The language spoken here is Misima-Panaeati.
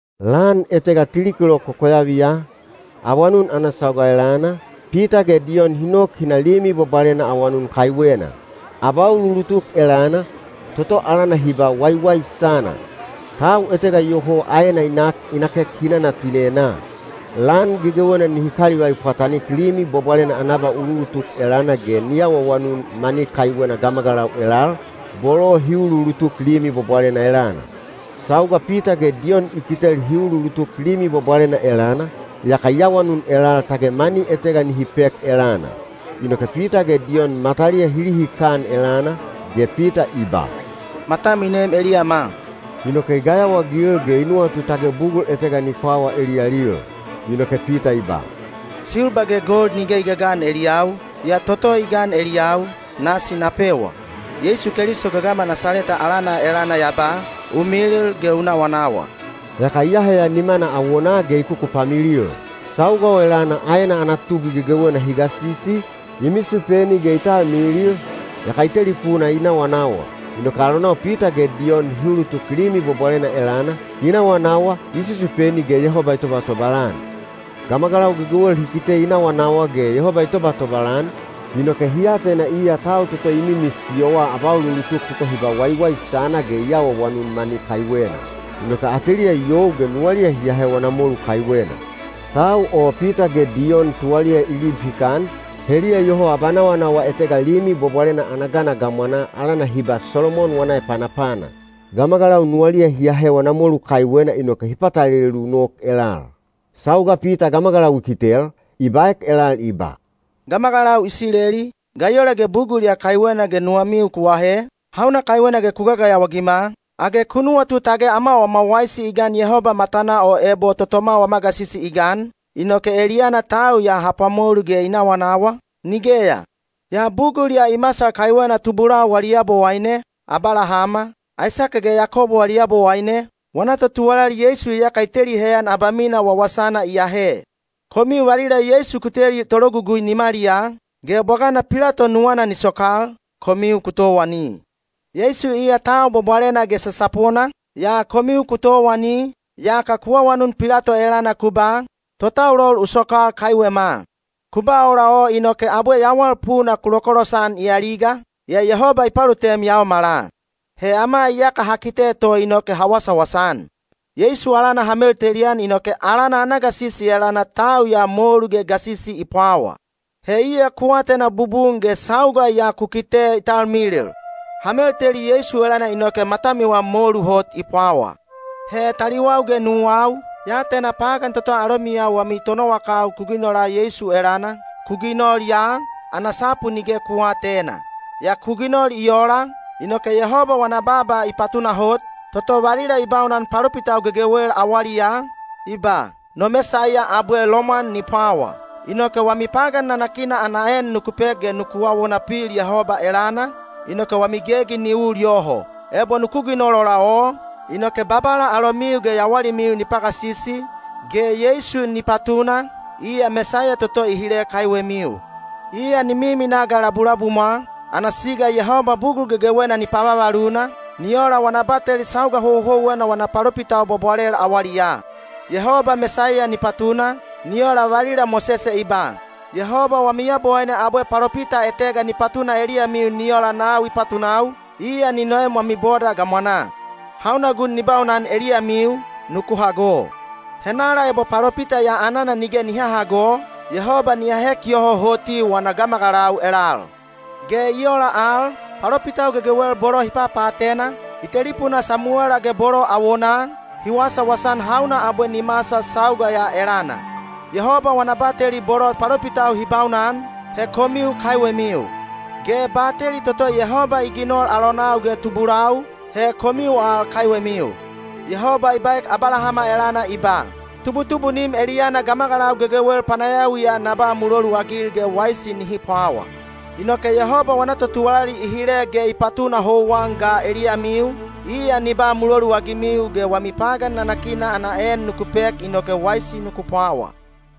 Lan etega tili kilok kokoyaviya, awanun ana sauga elana, Pita ge Diyon hi nok hi na Limi Bwabwalena awanun kaiwena. Abauluulutuk elana, toto alana hi ba “Waiwaisana”, tau etega iyoho aena i nak, i nakek hinana tinenaa. Lan gegewena nihi kalivai pwatanik Limi Bwabwalena ana abauluulutuk elana ge ni awaawanun mani kaiwena gamagalau elal, bolo hi uluulutuk Limi Bwabwalena elana. Sauga Pita ge Diyon i kitel hi uluulutuk Limi Bwabwalena elana, yaka i awanun elal tage mani etega nihi pek elana. Inoke Pita ge Diyon mataliya hi lihikan elana, ge Pita i ba, “Matam i nem eliyama.” Inoke i gayawaagil ge i nuwatu tage bugul etega ni pwawa eliyalil. Inoke Pita i ba, “Silba ge gold nige i gagan eliyau, yaa toto i gan eliyau, nasi na pewa: Yeisu Keliso gagama Nasaleta alana elana ya ba, ‘U milil ge u nawanawa.’” Yaka i aheya nimana awonaa ge i kukupamilil. Sauga o elana aena ana tubwi gegewena hi gasisi, i misupeni ge i talmilil, yaka i telipuna i nawanawa. Inoke alonau Pita ge Diyon hi ulutuk Limi Bwabwalena elana, i nawanawa, i susupeni ge Yehoba i tobatobal-an. Gamagalau gegewel hi kite i nawanawa ge Yehoba i tobatobal-an, inoke hi atena iya tau toto i mimisiyowa abauluulutuk toto hi ba “Waiwaisana” ge i awaawanun mani kaiwena. Inoke ateliya i you ge nuwaliya hi ahe wana molu kaiwena. Tau o Pita ge Diyon tuwaliya i lib hikan, heliya iyoho abanawanawa etega Limi Bwabwalena ana gana gamwanaa alana hi ba “Solomon wana Epanapana”. Gamagalau nuwaliya hi ahe wana molu kaiwena inoke hi patalelu nok elal. Sauga Pita gamagalau i kitel, i baek elal i ba, “Gamagalau Isileli, ga i ola bugul ya kaiwena ge nuwamiu ku ahe? Hauna kaiwena ku gagayawa-agima? Age ku nuwatu tage ama wama waisi i gan Yehoba matanaa o ebo totoma wama gasisi i gan, inoke eliyana tau ya ha pwamolu ge i nawanawa? Nigeya, yaa bugul ya i masal kaiwena tubulau wali Yabowaine, Abalahama, Aisake ge Yakobo wali Yabowaine, wana totuwalali Yeisu iyaka i teli heyan abamina wawasana i ahe. Komiu valila Yeisu ku teli tologugui nimaliyaa, ge bwagana Pilato nuwana ni sokal, komiu ku towani. Yeisu iya tau bwabwalena ge sasapona, yaa komiu ku towani, yaka ku awanun Pilato elana ku ba, ‘Totaulol u sokal kaiwema.’ Ku ba ola o inoke abwe Yawal Puna ku lokolosan i aliga, yaa Yehoba i palutem yaomala. He ama iyaka ha kite to inoke ha wasawasa-an. Yeisu alana ha meltelian inoke alana ana gasisi elana tau ya molu ge gasisi i pwawa. He iya ku atena bubun ge sauga ya ku kite i talmilil. Ha melteli Yeisu elana inoke matamiwa molu hot i pwawa. “He taliwau ge nuwau, ya atena pagan toto alomiyau wami tonowakau ku ginola Yeisu elana, ku ginol ya, ana sapu nige ku aatena. Yaa ku ginol i ola, inoke Yehoba wana baaba i patunahot, toto valila i baunan palopitau gegewel awaliyaa, i ba, ‘No Mesaiya abwe lomwan ni pwawa.’ Inoke wami pagan nanakina ana en nuku pek ge nuku awona pil Yehoba elana, inoke wami gegi ni ul yoho. Ebo nuku ginol ola o, inoke Babala alomiu ge yawalimiu ni pagasisi, ge Yeisu ni patuna, iya Mesaiya toto i hile kaiwemiu. Iya ni miminaa ga labulabumwa, ana siga Yehoba bugul gegewena ni pavavaluna, ni ola wana bateli sauga houhouwena wana palopitau bwabwalel awaliyaa. Yehoba Mesaiya ni patuna, ni ola valila Mosese i ba, ‘Yehoba wami Yabowaine abwe palopita etega ni patuna eliyamiu ni ola nau i patunau, iya ni noem wami boda gamwanaa. Hauna gun ni baunan eliyamiu, nuku hago. Henala ebo palopita ya anana nige ni hahago, Yehoba ni ahek yoho hoti wana gamagalau elal.’ “Ge i ola al, palopitau gegewel bolo hi papaatena, i telipunaa Samuwela ge bolo awonaa, hi wasawasa-an hauna abwe ni masal sauga ya elana. Yehoba wana bateli bolo palopitau hi baunan, he komiu kaiwemiu. Ge bateli toto Yehoba i ginol alonau ge tubulau, he komiu al kaiwemiu. Yehoba i baek Abalahama elana i ba, ‘Tubutubunim eliyana gamagalau gegewel panayawiya na ba muloluagil ge waisi nihi pwawa.’ Inoke Yehoba wana totuwalali i hile ge i patuna houwan ga eliyamiu, iya ni ba muloluagimiu ge wami pagan nanakina ana en nuku pek inoke waisi nuku pwawa.”